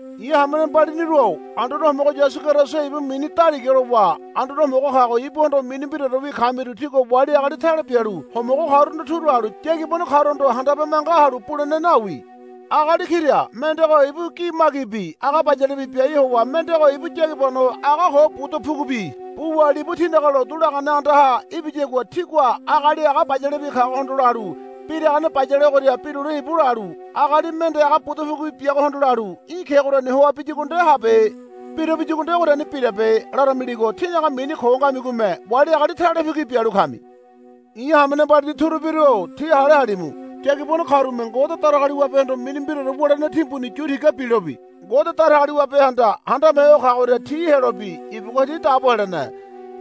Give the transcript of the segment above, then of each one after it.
I̱ hamene mbaliniru-o Anduane Homogo Yasu Keriso ibu mini daliga lowa Anduane Homogo kago ibuhondo mini mbiraorewi kamiru tígua wali agali tale bialu homogo karuhondo turu halu yagibano karuhondo handabe manga halu bulene nawi. Agali kira mendego ibu gi magibi aga bayalebi biai howa mendego ibu yagibano aga ko buda pugubi buwa libu tínaga lotu lagane andaha ibiyagua tígua agali aga bayalebi kagohondo lalu, Biragane bayale ogoria birule íbu, lalu agali mende aga budu pugubi biagohondo lalu, Í̠ kegoriani hoa biyagua nde habe. Biruabiyagua nde ogoriani birabe, laramiligo tínaga mini ko ngamigome wali agali talebu ki bialu kami. I̱ hamene mbalini turubiru-o tí hale halimu. Yagibano karume Ngode Datagaliwabehondo mini mbiraore wulene timbuni yu tiga bilobi Ngode Datagaliwabehanda handame ho kagoria ti helobi ibugua ti dabo helene.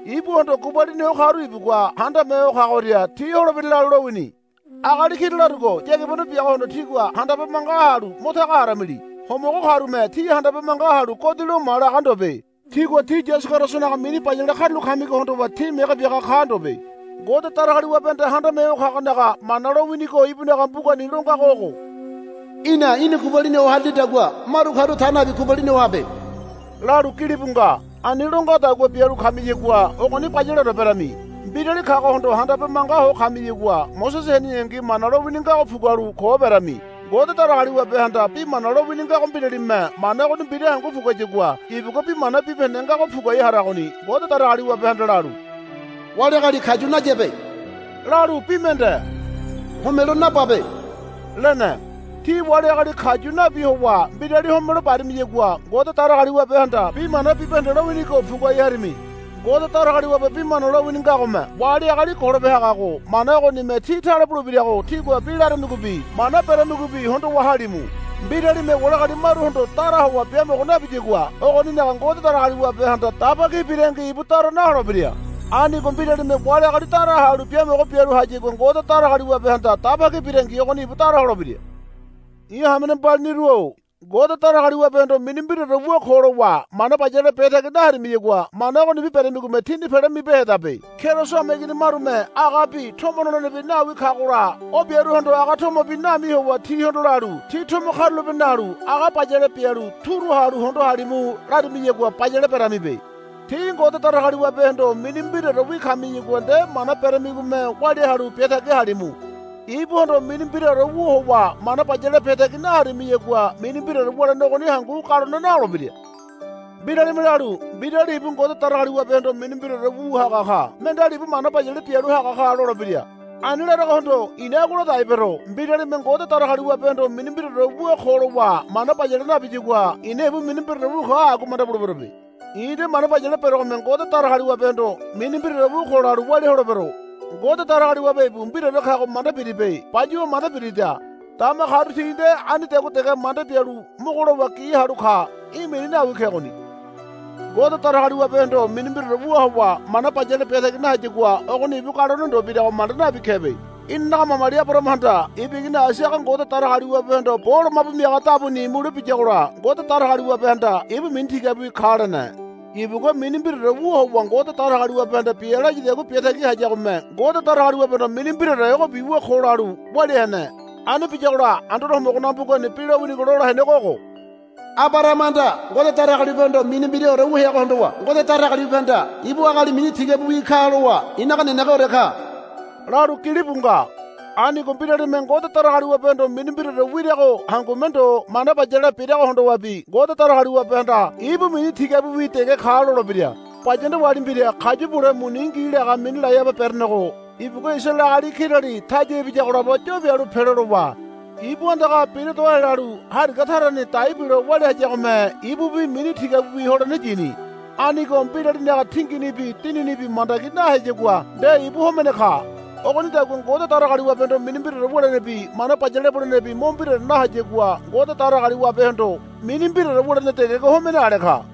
Ibuhondo gubalini ho karu ibugua handame ho kagoria ti holebira lalu lowini. Agali kira larugo yagibano biagohondo tígua handabe manga halu mo taga haramili. Homogo karume tí handabe manga halu, Godi lo ma, laga ndobe. Tigua tí Yasu Kerisonaga mini bayale karulo kamigo hondowa tí mege biaga ka ndobe. Ngode Datagaliwabehanda Handame Ho kagonaga mana lowinigo ibunaga mbugani longago ogo, Í̠na í̠ni gubalini ho harilidagua maru karu ta nabi gubalini ho habe, lalu gilibu nga. Ani lo ngadagua bialu kamiyagua ogoni bayaleore berami. Mbirali kagohondo handabe manga ho kamiyagua Mosese heneyangi Mana lowini ngago pugualu ko berami. Ngode Datagaliwabehanda bi mana lowini ngago mbiralime mana ogoni mbira hangu puguayagua ibugua bi mana bibahende ngago puguai haragoni. Ngode Datagaliwabehanda lalu, Wali agali kayu nayabe, lalu bi mende, Homelo nababe, lene. Tí wali agali kayu nabi howa mbirali homelo barimiyagua Ngode Datagaliwabehanda bi mana bibahende lowinigo puguai harimi. Ngode Datagaliwabe bi mana lowini ngagome wali agali golope hagago mana ogonime tí tale bulebirago tígua bi laramigobi mana beramigobi hondowa halimu. Mbiralime wali agali maruhondo dara howa biamogo nabiyagua ogoninaga Ngode Datagaliwabehanda dabi ki birangi ibu dara naholebira. Anigo mbiralime wali agali dara halu biamogo bialu hayagua Ngode Datagaliwabehanda daba ki birangi ogoni ibu dara holebira. I̱ hamene mbaliniru-o, Ngode Datagaliwabehondo mini mbiraore wu ko, lowa mana bayale biatagi naharimiyagua mana ogonibi beramigome tíni pele mibehedabe. Keriso hameigini marume agabi tomo nolenebi nawi kagola o biaruhondo aga tomobi nami howa tihondo lalu, Tí tomo karulape nalu aga bayale bialu turu halu hondo halimu, larimiyagua bayale beramibe. Tí Ngode Datagaliwabehondo mini mbiraorewi kamiyagua nde mana beramigome walia halu biatagi halimu. Ibuhondo mini mbiraore wu howa mana bayale biatagi naharimiyagua mini mbiraore wulene ogoni hangu galone naholebira. Mbiralime lalu, Mbirali ibu Ngode Datagaliwabehondo mini mbiraore wu haga ka mendeali ibu mana bayale bialu haga ka, lolebira. Ani laragohondo i̱na agua ladai bero. Mbiralime Ngode Datagaliwabehondo mini mbiraore wu ko lowa mana bayale nabiyagua i̱na ibu mini mbiraore wu ka agua manda buleberobe. I̱ nde mana bayale berogome Ngode Datagaliwabehondo mini mbiraore wu ko, lalu walia holebero. Ngode Datagaliwabe ibu mbiraore kago manda biribe. Bayuwa manda birida. Dama karu ti nde anidagua dege manda bialu mogo lowa gi halu ka. Í̠ mini nawi kegoni. Ngode Datagaliwabehondo mini mbiraore wu howa mana bayale biatagi nahayagua ogoni galone ndo berego manda nabi kebe. Inanaga mamali Abarahamahanda ibu igini Aisaga Ngode Datagaliwabehondo bo lomabu miaga dabuni mule biyagola Ngode Datagaliwabehanda, Ibu mini tigabiwi ka, lene. Ibugua mini mbiraore wu howa Ngode Datagaliwabehanda bia layadagua biatagi hayagome Ngode Datagaliwabehondo mini mbiraore ogobi wu ko lalu walia hene. Ani biyagola Anduane Homogonaga mbugani bi lowinigo lola henego ogo, Abarahamahanda Ngode Datagaliwabehondo mini mbiraore wu heago hondowa Ngode Datagaliwabehanda, Ibu agali mini tigabiwi ka, lowa, I̱naga nenegeore ka, lalu gilibu nga. Anigo mbiralime Ngode Datagaliwabehondo mini mbiraore wirago hangume ndo mana bayale birago hondowabi Ngode Datagaliwabehanda, Ibu mini tigabiwi dege ka, lolebira. Bayanda wali mbira kayu bule muni ngi laga mini Lahaba berenego ibugua Isaraele agali kirali taya ibiyago labo yo pialu pelo lowa ibu andaga bira do helalu hariga tarani dai bilo walia hayagome ibubi mini tigabiwi holene yini. Anigo mbiralinaga tinginibi dininibi mandagi naheyagua nde ibu homene ka. Ogonidagua Ngode Datagaliwabehondo mini mbiraore wulenebi mana bayale bulenebi mo mbiraore nahayagua Ngode Datagaliwabehondo mini mbiraore wulene degego homene ale ka.